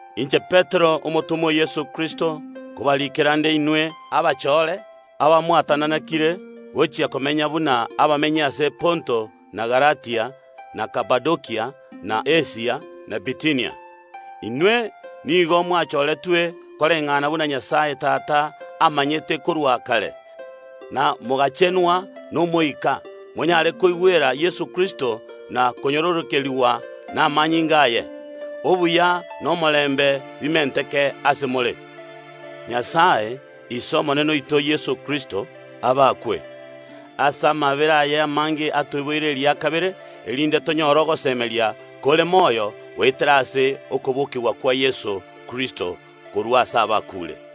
Korwa ase Petero, omotomwa o Yeso Kristo, gochia ase abachore ba Nyasae, abamwatananekire gochia komenya buna abamenyi ase Ponto, na Galatia, na Kapadokia, na Asia, na Bitinia. Inwe nigo mwachoretwe koreng’ana buna Nyasae Tata amanyete korwa kare, na mogachenwa n’Omoika, monyare koigwera Yeso Kristo, na konyororokerigwa namanyinga aye. Obuya na omorembe bimenteke ase oboikeranu bwonsi. Abakwe Nyasae, ise Omonene oito Yeso Kristo! Ase amaabera aye amange atoiboire eria kabere, erinde tonyore ogosemeria kore moyo goetera ase okobokigwa kwa Yeso Kristo korwa ase abakuure,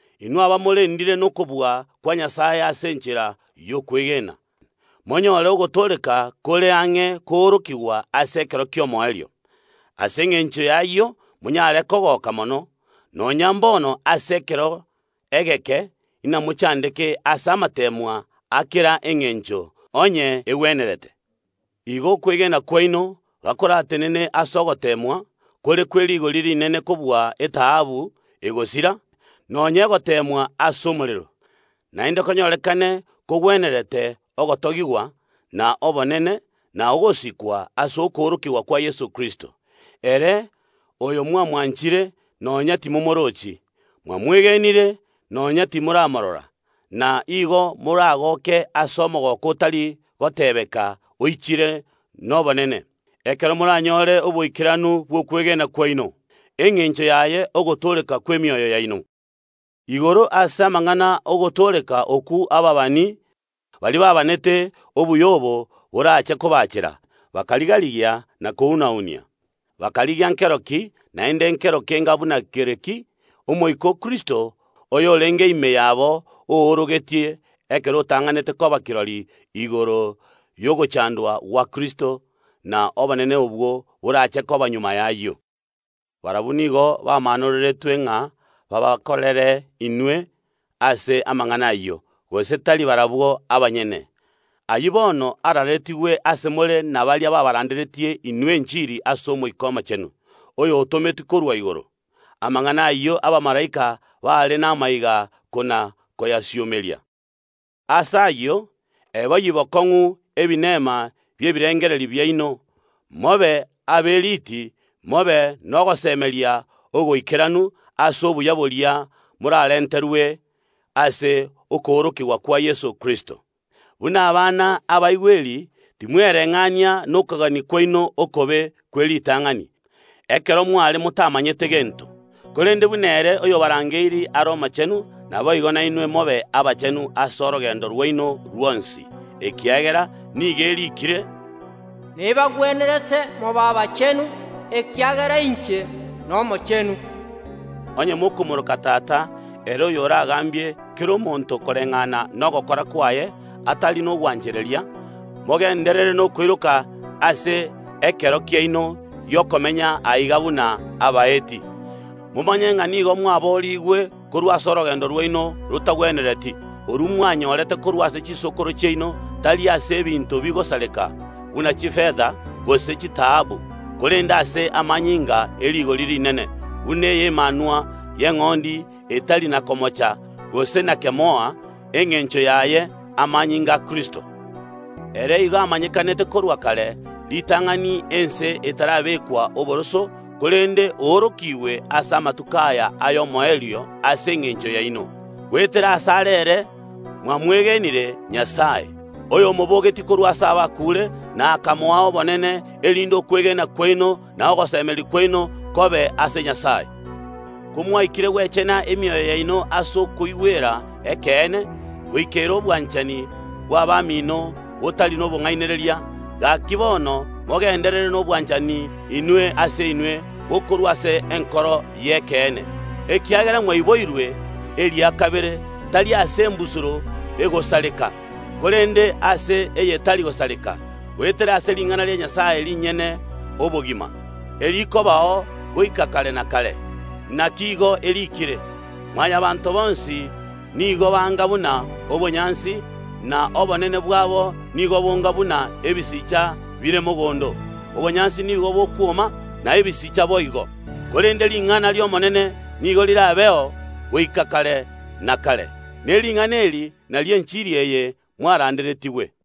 inwe abamorendire nokobua kwa Nyasae ase enchera y’okwegena, monyore ogotooreka kore ang’e koorokigwa ase ekero ki’omoerio. Ase engencho y’ayio monyare kogoka mono, nonya mbono ase ekero egeke inamochandeke ase amateemwa a kera engencho, onye egwenerete. Igo okwegena kwaino, gakoratenene ase ogoteemwa, kore kwe rigori rinene kobua etaabu egosira (nonya egoteemwa ase omorero) naende konyorekane kogwenerete ogotogigwa, na obonene, na ogosikwa ase okoorokigwa kwa Yeso Kristo. Ere oyo mwamwanchire, nonya timomoorochi, mwamwegenire, nonya timoramorora, na igo moragoke ase omogooko otari gotebeka oichire nobonene, ekero moranyore oboikeranu bw’okwegena kwaino, engencho yaye ogotooreka kw’emioyo yaino. Igoro ase amang’ana ogotooreka okwo ababani, baria baabaanete obuya obo borache kobacheera, bakariga‐rigia na kounenkia. Bakarigia nkero ki, naende nkero kenga buna kere ki, Omoika o Kristo, oyorenge ime yabo, oorogetie, ekero otang’anete koba kirori igoro y’ogochandwa gwa Kristo, na obonene obwo borache koba magega y’ayio. Nyasae nigo abamaanorerete ng’a baabakorere inwe ase amang’ana ayio, gose tari barabwo abanyene. Ayio bono araaretigwe ase more nabaria baabaranderetie inwe enchiri ase Omoika Omochenu, oyotometwe korwa igoro. Amang’ana ayio abamalaika bare namaiga kona‐koyasiomeria. Ase ayio, eboyie bokong’u ebinema bi’ebirengererio biaino, mobe aberiti, mobe nogosemeria ogoikeranu ase obuya boria moraarenterwe ase okoorokigwa kwa Yeso Kristo. Buna abana ba Nyasae abaigweri timwereng’ania nokogania kwaino okobe kw’eritang’ani, ekero mware motamanyete gento, korende buna ere, oyobarangeirie, are omochenu, naboigo nainwe mobe abachenu ase orogendo rwaino rwonsi, amariiko nigo agoteeba, mobe abachenu ekiagera inche nomochenu. Onye mokomooroka Tata, ere oyoragambie kera omonto koreng’ana nogokora kwaye atari nogwanchereria, mogenderere nokoiroka ase ekero kiaino gi’okomenya aiga buna abaeti. Momanye ng’a nigo mwaboorigwe korwa ase orogendo rwaino rotagwenereti, orwo mwanyorete korwa ase chisokoro chiaino, tari ase ebinto bigosareka, buna chifeta gose chitaabu, korende ase amanyinga e rigori rinene, buna ay’emanwa y’eng’ondi etari na komocha, gose na kemoa, engencho yaye amanyinga a Kristo. Ere nigo achoretwe na Nyasae korwa kare, ritang’ani ense etarabekwa oboroso, korende oorokigwe ase amatuko aya ay’omoerio ase engencho yaino. Goetera asare ere mwamwegenire Nyasae, oyomobogetie korwa ase abakuure na akamoa obonene, erinde okwegena kwaino na ogosemeria kwaino kobe ase Nyasae. Komwaikire gwechena emioyo yaino ase okoigwera ekeene, goikera obwanchani bw’abamino botari nobong’ainereria, gaki bono mogenderere nobwanchani inwe ase inwe bokorwa ase enkoro y’ekeene, ekiagera mwaiboirwe eria kabere, tari ase embusuro egosareka, korende ase eyetari gosareka, goetera ase ring’ana ria Nyasae rinyene obogima, erikobao goika kare na kare. Naki igo eriikire, “Mwanyabaanto bonsi nigo banga buna obonyansi, na obonene bwabo nigo bonga buna ebisicha bire mogondo. Obonyansi nigo bokwoma, na ebisicha boigo, korende ring’ana ri’Omonene nigo rirabeo goika kare na kare.” Ne ring’ana eri nario enchiri eye mwaranderetigwe.